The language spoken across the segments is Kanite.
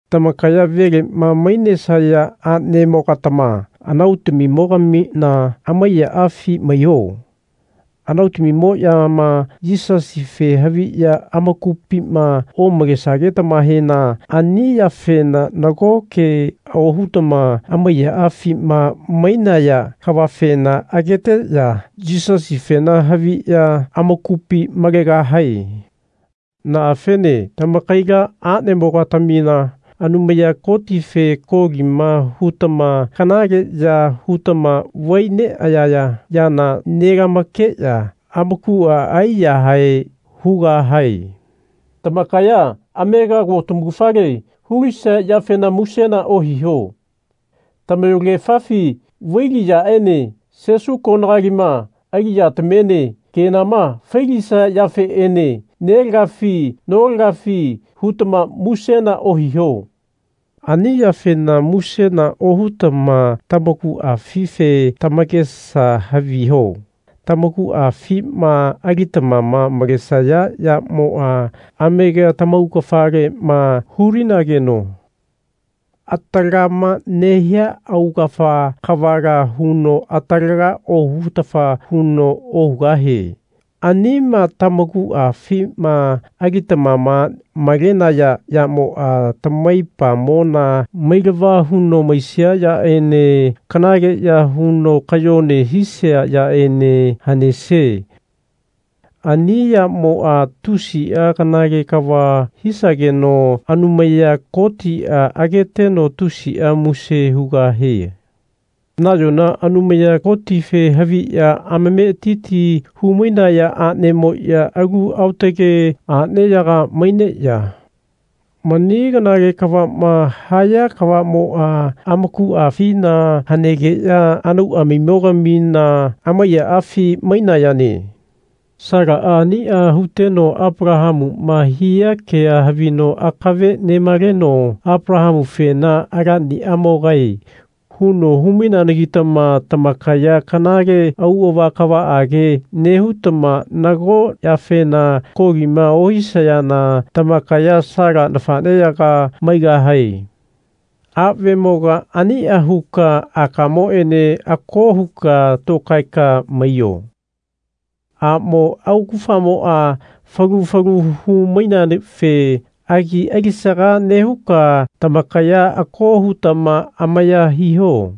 Tamakaya velema mainesaya anemogatama anautamimo-gamina amaiyaafi maiho. Anautamimoyama Yisasife haviya amakupima omalesagetamahena ani yafena nago kea ohutama amaiyaafima mainaya kavafena ageteya Yisasifena haviya amakupi malegahae. Naafene tamakaila anemo-gatamina Anumaya Kotife kolima hutama kanaleya hutama vai neayaya yana nelamakeya amakua aiyahae hugahae. Tamakaya amega ko tamaugafale hu-lisaya yafena musena ohiho. Tamayolagefafi vaili yaene sesu konagalima ali yatamiene kenama fai-lisaya yafeenena nelagafi notagafi hutama musena ohiho. Ani yafena musena ohutama tamakuafife tamakesa haviho. Tamakuafima alitamama malesaya yamoa amega tamaugafalema hu-linageno atalagama nehia augafa kavala huno atalaga ohutafa huno ohugahie. Anima tamakuafima alitamama malenaya yamoa tamaipamona mailava huno maisia yaene kanaleya huno kayone hisaya yaene hanesie. Ani yamoa tusia kanale kava hisageno Anumaya Kotia ageteno tusia muse hugahie. Nayona Anumaya Kotife haviya amametiti hu-mainaya anemoya alu aotage aneyaga maineya mani kanale kavama haya kavamoa amakuafina hanegeya anauamimo-gamina amaiyaafi mainayane. Salaa ania huteno Apalahamuma hia kea havino akave nemaleno Apalahamufena Alaniamogae. huno hu-maineanagitama tamakaya kanale auava kavaage nehutama nago yafena kolima ohisayana tamakaya Sala nafaneyaga maigahae. Avemoga ania huka akamoene ako huka tokaeka maiyo. Amo augafamoa falu falu hu-maineafe agi alisaga nehuka tamakaya ako hutama amaya hiho.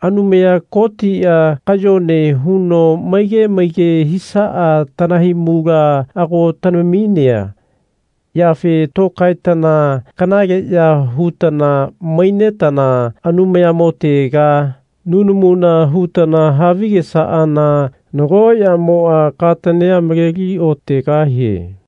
Anumaya Kotia kayone huno maige maige hisaa tanahaimula ago tanaminea yafe tokaetana kanaleya hutana mainetana Anumayamotega nunamuna hutana havigesaana nago yamoa katania maleli otegahie.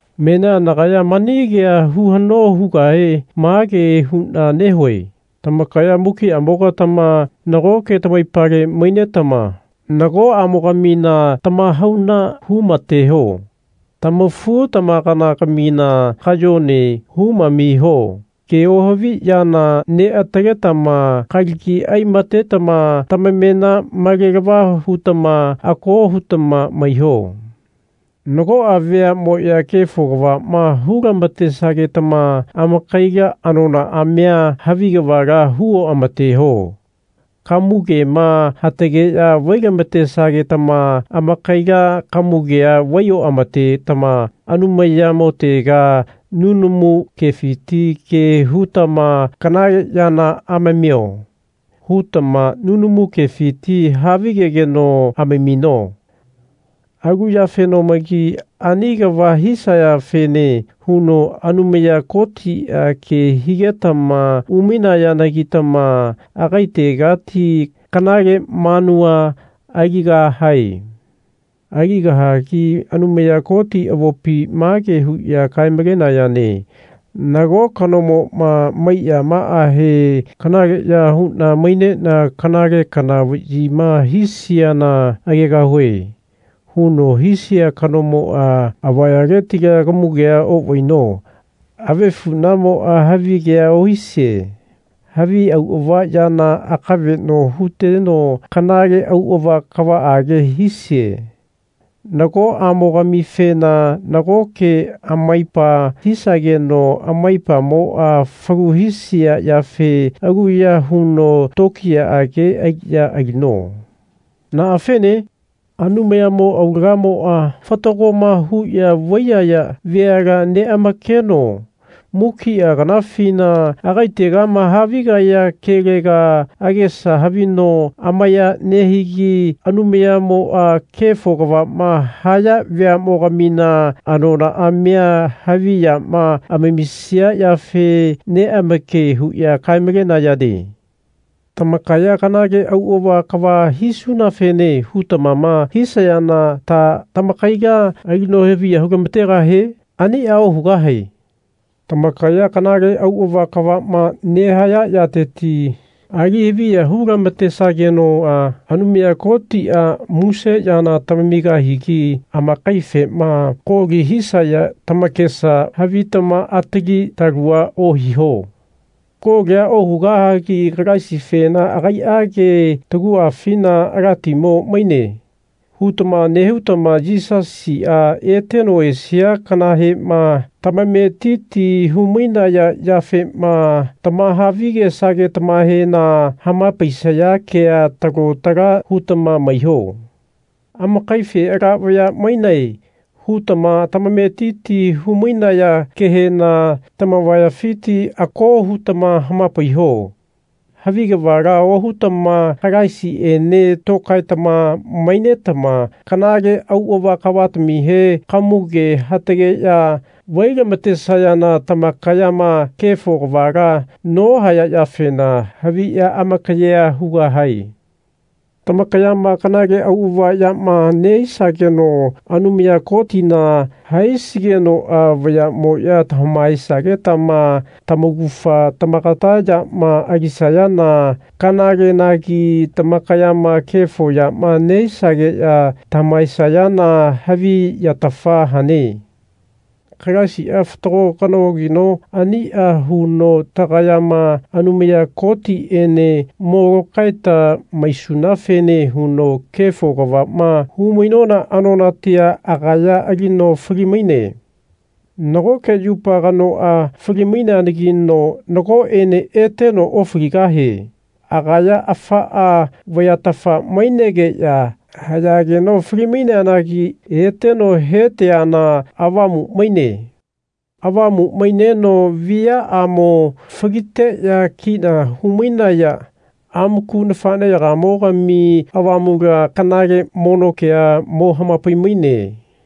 Menia nagaya mani kea hu hano hugahe mage huna nehue tamakaya mukiamogatama nagoke tamaipale mainetama nagoamoga-mina tamahauna hu-mateho. Tamafu-tamakana-gamina kayone humamiho. Ke ohavi yana neataletama kalagi ai-matetama tamamena malelava hutama ako hutama maiho. Nagoa veamoya kefo kavama hu-lamatesagetama amakaila anonaamia havi kavala hu oamateho. Kamugema hatageya vai-lamatesagetama amakaila kamugea vai oamatetama Anumayamotega nunamu kefiti ke hutama Kanale yana amamio. hutama nunamu kefiti havigegeno amamino. Alu yafenomagi ani kava hisayafene huno Anumaya Kotia ke higetama umainayanagitama agaitegati kanale manua aligahae. Aligahagi Anumaya Koti avopi mage huya kae-malenayane Nago kanomoma maiyamaahe Kanaleya huna mainena kanale kana vayima hisiana agegahue. huno hisia kanomoa avayaletila kamugea ovaino avefunamoa havigea ohisie. Havi auava yana akaveno huteno kanale auava kavaage hisie. Nagoamogamifena nagoke amaipa hisageno amaipamoa falu hisia yafe aluya huno tokiyaage aliya alino. Naa fene? Anumayamo aulagamoa fatagoma huya vaiyaya veala neamakeno mukia kanafina agaitegama havigaya kelega agesa havino amaya nehigi Anumayamoa kefo kavama haya veamogamina anonaamia havi yama amamisia yafe neamake huya kae-malenayane. Tamakaya kanale auava kava hisunafene hutamama hisayana ta tamakaila alino haviya hu-lamategahie? Ania ohugahae. Tamakaya kanale auava kavama nehaya yateti ali-haviya hu-lamatesagenoa Anumaya Kotia muse yana tamamigahigi amakaifena koli hisaya tamakesa havitama atali talua ohiho. Kolia ohugahagi Kalaisifena Agaiage taguafina Alatimo maine. hutama nehutama Yisasia eteno esia kanahema tamametiti hu-mainaya yafema tamahavi-gesagetamahena hamapaisaya kea talo tala hutama maiho. Amakaife Ala vaya mainae. hutama tamametiti hu-mainaya kehena tamavayafiti ako hutama hamapaiho. Havi kavala ohutama Kalaisiene tokaetama mainetama kanale auava kavatamihe kamuge hatageya vai-lamatesayana tamakayama kefo kavala nohaya yafena haviya amakayea hugahae. Tamakayama kanale auava yama nehisageno Anumaya Kotina haisigenoa vayamoya tamahaesa-getama tamaugafa tamakata yama alisayana kanalenagi tamakayama kefo yama nehisageya tamahaesayana havi yatafa hane. Kalaisia fatago kanogino ania huno tagayama Anumaya Kotiene mo lokaeta maisunafene huno kefo kavama hu-mainona anonatia agaya alino fali-maine. Nagoke yupa kanoa fali-maineanagino nagoene eteno ofaligahie. Agaya afaa vayatafa mainegeya hayageno fali-maineanagi eteno heteana avamu maine. Avamu maineno viaamo faliteya kina hu-mainaya amaku nafaneyagamogami avamula kanale mono kea mo hamapaimaine.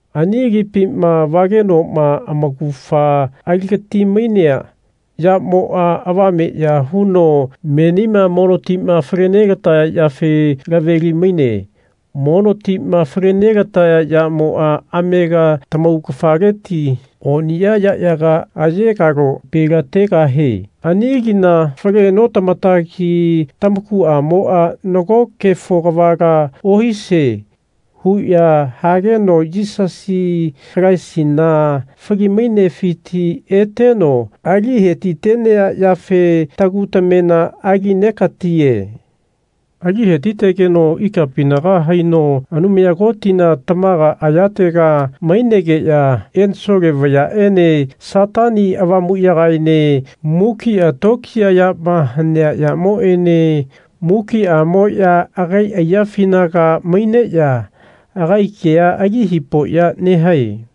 Ani lipima vagenoma amaugafa aligati-mainea yamoa avame ya huno menima mono tima fale nelataya yafe laveli-maine. Mono tima fale nelataya yamoa amega tamaugafaleti oniya yayaga ayegalo-pelategahe ani lina fale notamatagi tamakuamoa Nago kefo kavala ohisie. huya hageno Yisasi Kalaisina fali-mainefiti eteno alihetitenea yafe tagu tamena alinegatie. Ali hetitegeno ikapinaga haino Anumaya Kotina tamaga ayatega mainegeya ensole vayaene Satani Avamuyagaene mukia tokiya yama hanea yamoene mukiamoya agai aiyafinaga maineya agai kea alihipoya nehae.